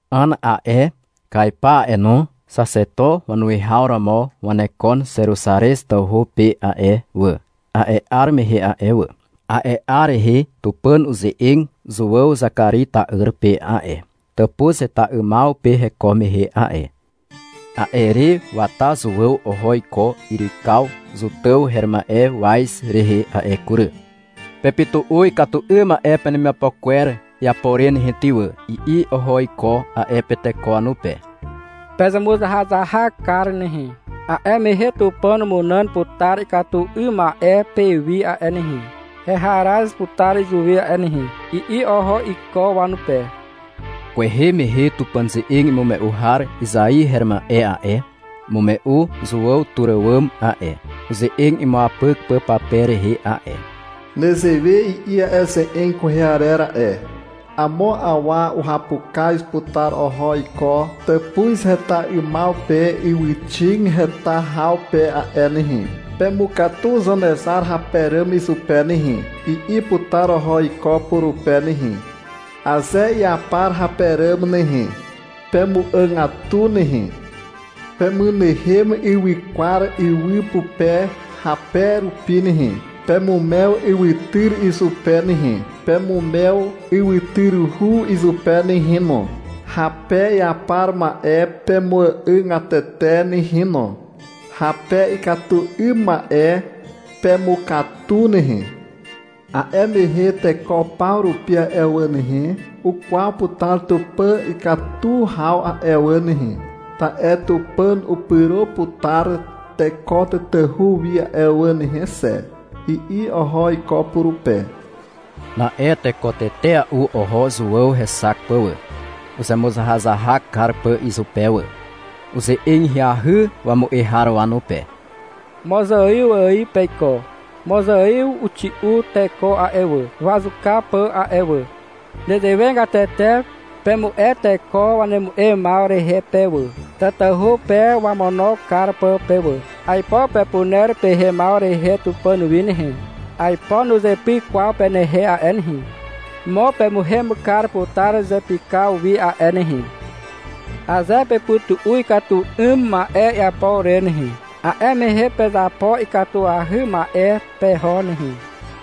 Ana a'e, Kaipa a'e no, xaxeto wanuwihaw romo wanekon Zeruzarez tawhu pe a'e wà, a'e 'ar mehe a'e wà. A'e 'ar rehe Tupàn uze'eg Zuàw Zakari ta'yr pe a'e, tàpuz heta 'ymaw pe heko mehe a'e. A'e re wata Zuàw oho iko yrykaw Zotàw her ma'e waz rehe a'e kury. — Pepytu'u ikatu 'ym ma'e penemiapo kwer iapo re nehe ty wà, i'i oho iko a'e pe teko wanupe. — Pezemuzahazahak kar nehe, a'e mehe Tupàn umunàn putar ikatu 'ym ma'e pewi a'e nehe, heharaz putar izuwi a'e nehe, i'i oho iko wanupe. Kwehe mehe Tupàn ze'eg imume'u har Izai her ma'e a'e, umume'u Zuàw tur àwàm a'e, uze'eg imuapyk pà pape rehe a'e. Nezewe i'i a'e ze'eg kwehe arer a'e. Amo awa uhapukaz putar oho iko tàpuz heta 'ymaw pe ywyxig heta haw pe a'e nehe. — Pemukatu Zanezar rape ràm izupe nehe, i'i putar oho iko purupe nehe. — Aze iapar hape ràm nehe, pemu'àgatu nehe. — Pemynehem ywykwar ywy pupe hape rupi nehe. Pemumew ywytyr izupe nehe, pemumew ywytyruhu izupe nehe no. Hape iapar ma'e pemuàgatete nehe no. Hape ikatu 'ym ma'e, pemukatu nehe. A'e mehe teko paw rupi a'e wà nehe, ukwaw putar Tupàn ikatu haw a'e wà nehe, ta'e Tupàn upyro putar teko tatahu wi a'e wà nehe xe, i'i oho iko purupe. Na'e teko tetea'u oho Zuàw hexak pà wà, uzemuzahazahak kar pà izupe wà. Uze'eg ahyahy wamu'e har wanupe. — Mozaiw ài peiko. Mozaiw uxi'u teko a'e wà, wazuka pà a'e wà. Nezewegatete pemu'e teko wanemu'emaw rehe pe wà, tatahu pe wamono kar pà pe wà. Aipo pepuner pehemaw rehe Tupàn wi nehe, aipo nuzepyk kwaw penehe a'e nehe. Mo pemuhem kar putar izepykaw wi a'e nehe. Aze pepytu'u ikatu 'ym ma'e iapo re nehe, a'e mehe pezapo ikatuahy ma'e peho nehe,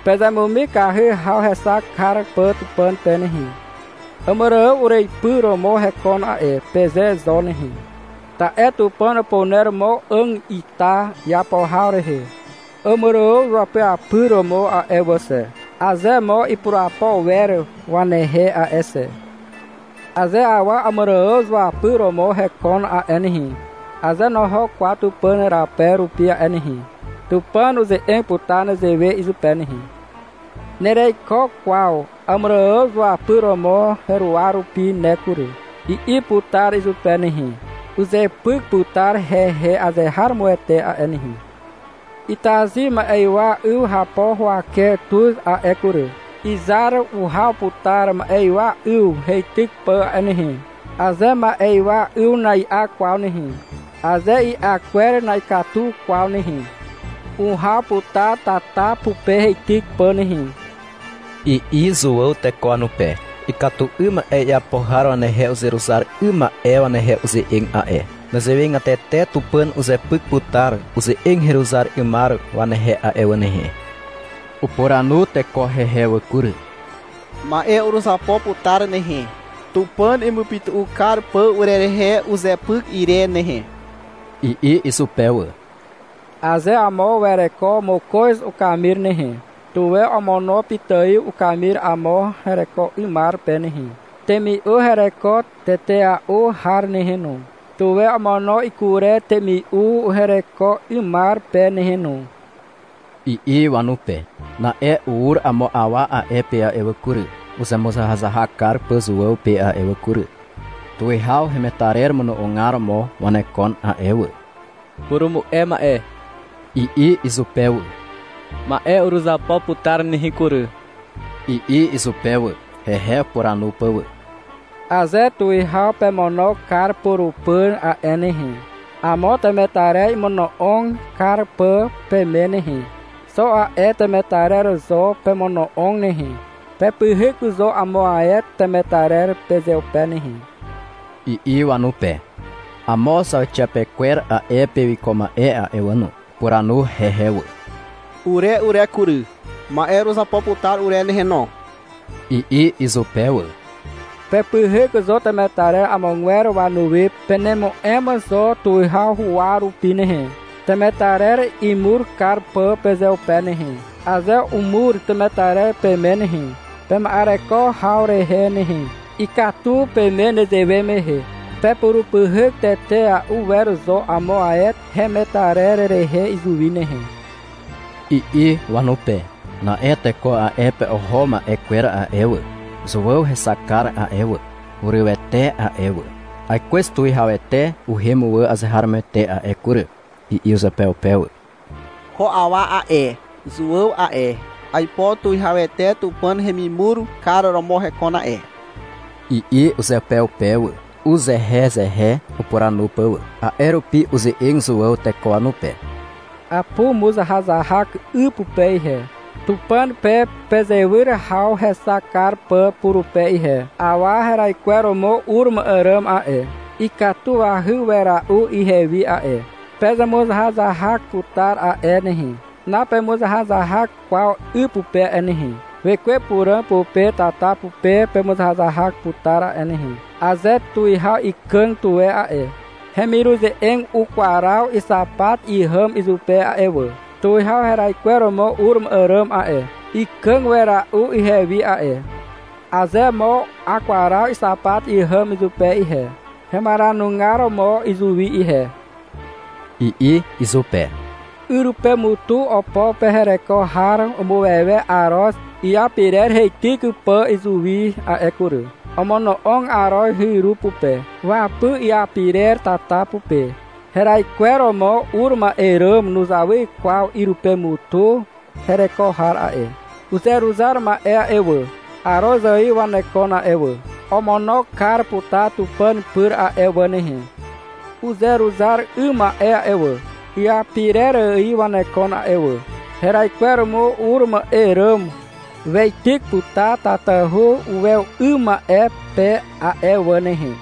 pezemumikahy haw hexak kar pà Tupàn pe nehe. — Àmàrààw ureipy romo hekon a'e, peze zo nehe. Ta'e Tupàn upuner mo 'àg ita iapo haw rehe Àmàrààw izuapyapyr romo a'e wà xe, aze mo ipurapo wer wanehe a'e xe. Aze awa Àmàrààw zuapyr romo hekon a'e nehe, aze noho kwaw Tupàn rape rupi a'e nehe, Tupàn uze'eg putar nezewe izupe nehe. — Nereiko kwaw Àmàrààw izuapyr romo heruwa rupi ne kury, i'i putar izupe nehe. Uzepyk putar hehe azeharomoete a'e nehe. Itazy ma'ywa 'yw hapo huwake tuz a'e kury. Izar uhaw putar ma'ywa 'yw heityk pà a'e nehe. Aze ma'ywa 'yw na'i'a kwaw nehe, aze i'a kwer na'ikatu kwaw nehe, uhaw putar tata pupe heityk pà nehe, i'i Zuàw teko wanupe. (Ikatu 'ym ma'e iapo har wanehe uzeruzar 'ym ma'e wanehe uze'eg a'e.) Nezewegatete Tupàn uzepyk putar uze'eg heruzar 'ymar wanehe a'e wà nehe. Upuranu teko hehe wà kury. — Ma'e uruzapo putar nehe, Tupàn imupytu'u kar pà urerehe uzepyk ire nehe, i'i izupe wà. — Aze amo wereko mokoz ukamir nehe, tuwe omono pitài ukamir amo hereko 'ymar pe nehe. Temi'u hereko tetea'u har nehe no, tuwe omono ikurer temi'u hereko 'ymar pe nehe no, i'i wanupe. Na'e ur amo awa a'e pe a'e wà kury, uzemuzahazahak kar pà Zuàw pe a'e wà kury. Tuwihaw hemetarer mono'ogar romo wanekon a'e wà. — Purumu'e ma'e, i'i izupe wà. — Ma'e uruzapo putar nehe kury, i'i izupe wà, hehe upuranu pà wà. — Aze tuwihaw pemono kar purupyr a'e nehe, amo temetarer imono'og kar pà peme nehe, xo a'e temetarer zo pemono'og nehe. Pepyhyk zo amo ae temetarer pezeupe nehe, i'i wanupe. Amo zauxiapekwer a'e pe wiko ma'e a'e wà no. Upuranu hehe wà. — Ure ure kury, ma'e uruzapo putar ure nehe no, i'i izupe wà. — Pepyhyk zo temetarer amogwer wanuwi pekàgaw rupi hehe. Penemu'em zo tuwihaw huwa rupi nehe, temetarer imur kar pà pezeupe nehe. Aze umur temetarer peme nehe, pema'ereko haw rehe nehe, ikatu peme nezewe mehe. Pepurupyhyk tetea'u wer zo amo ae hemetarer rehe izuwi nehe, i'i wanupe. Na'e teko a'e pe oho ma'e kwer a'e wà, Zuàw hexakar a'e wà, hurywete a'e wà. — Aikwez Tuwihawete uhem wà azeharomoete a'e kury, i'i uzeupeupe wà. — Ko awa a'e, Zuàw a'e, aipo tuwihawete Tupàn hemimur kar romo hekon a'e, i'i uzeupeupe wà, uzehezehe upuranu pà wà. A'e rupi uze'eg Zuàw teko wanupe. — Apumuzahazahak 'y pupe ihe, Tupàn pe pezewyr haw hexak kar pà purupe ihe. Awa heraikweromo ur ma'e ràm a'e, ikatuahy wera'u ihewi a'e. Pemuzahazahak putar a'e nehe. Napemuzahazahak kwaw 'y pupe a'e nehe. Wekwe Puràg pupe tata pupe pemuzahazahak putar a'e nehe. Aze tuwihaw ikàg tuwe a'e, hemiruze'eg ukwaraw ixapat ihàm izupe a'e wà. Tuwihaw heraikweromo ur ma'e ràm a'e, ikàg wera'u ihewi a'e. Aze mo akwaraw ixapat ihàm izupe ihe, hemaranugar mo izuwi ihe, i'i izupe. Yrypemutu opo pe hereko har umuwewe aroz iapirer heityk pà izuwi a'e kury. Omono'og aroz hyru pupe. Wapy iapirer tata pupe. Heraikweromo ur ma'e ràm nuzawy kwaw yrypemutu hereko har a'e. Uzeruzar ma'e a'e wà, aroz ài wanekon a'e wà. Omono kar putar Tupàn pyr a'e wà nehe. Uzeruzar 'ym ma'e a'e wà, iapirer ài wanekon a'e wà. Heraikweromo ur ma'e ràm weityk putar tatahu uwew 'ym ma'e pe a'e wà nehe.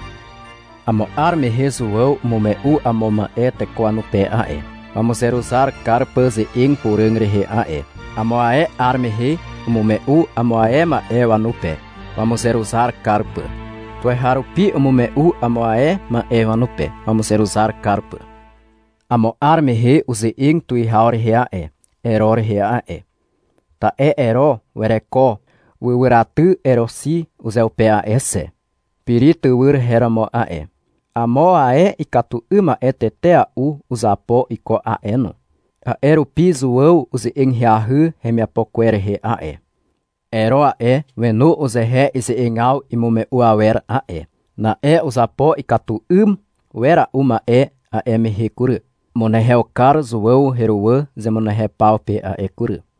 Amo 'ar mehe Zuàw umume'u amo ma'e teko wanupe a'e, wamuzeruzar kar pà ze'eg puràg rehe a'e. Amo ae 'ar mehe umume'u amo ae ma'e wanupe, wamuzeruzar kar pà. Tuweharupi umume'u amo ae ma'e wanupe wamuzeruzar kar pà. Amo 'ar mehe uze'eg tuwihaw rehe a'e, Ero rehe a'e. Ta'e Ero wereko wywyraty Eroxi uzeupe a'e xe. Piri tywyr her romo a'e. Amo ae ikatu 'ym ma'e tetea'u uzapo iko a'e no. A'e rupi Zuàw uze'eg ahyahy hemiapo kwer rehe a'e. Ero a'e, wenu uzehe ize'egaw imume'u awer a'e. Na'e uzapo ikatu 'ym wera'u ma'e a'e mehe kury. Umunehew kar Zuàw heruwà zemunehew paw pe a'e kury.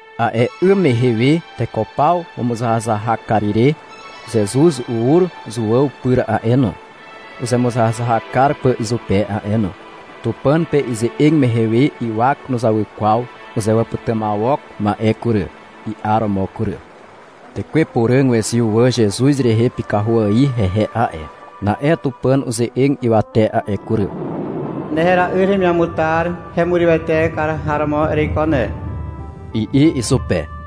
A'e 'ym mehe we teko paw wamuzahazahak kar ire Zezuz ur Zuàw pyr a'e no, uzemuzahazahak kar pà izupe a'e no. Tupàn pe ize'eg mehe we ywak nuzawy kwaw uzewàpytymawok ma'e kury, i'aromo kury. Tekwe Puràg wezyw wà Zezuz rehe pykahu ài hehe a'e. Na'e Tupàn uze'eg ywate a'e kury. — Ne hera'yr heremiamutar hemurywete kar har romo ereiko ne, i'i izupe.